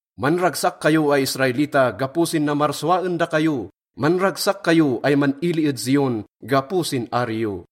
Manragsak kayo ay Israelita gapo sin namarsua en dakayo, manragsak kayo ay man-ili ed Zion gapo sin ari yo.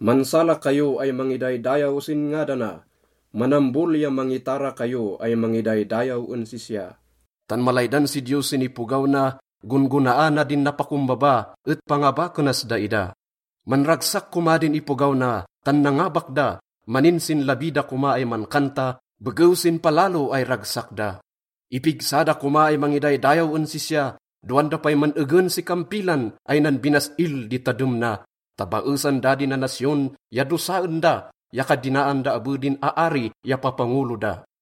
Mansala kayo ay mangidaydayaw sin ngadana, manambol ya mangitara kayo ay mangidaydayaw en sisya. Tan malaydan si Diyos sin ipogaw na, gon-gonaana din napakombaba et pangabakenas daida. Manragsak koma din ipogaw na tan nangabak da, maninsinlabi da koma ay mankanta begew sin palalo ay ragsak da. Ipigsa da koma ay mangidaydayaw en sisya, dowan da pay man-egen si kampilan ay nanbinas-il di tadem na, ta baesan da din nanasyon ya dosaen da, ya kadinaan da abe din aari ya papangolo da.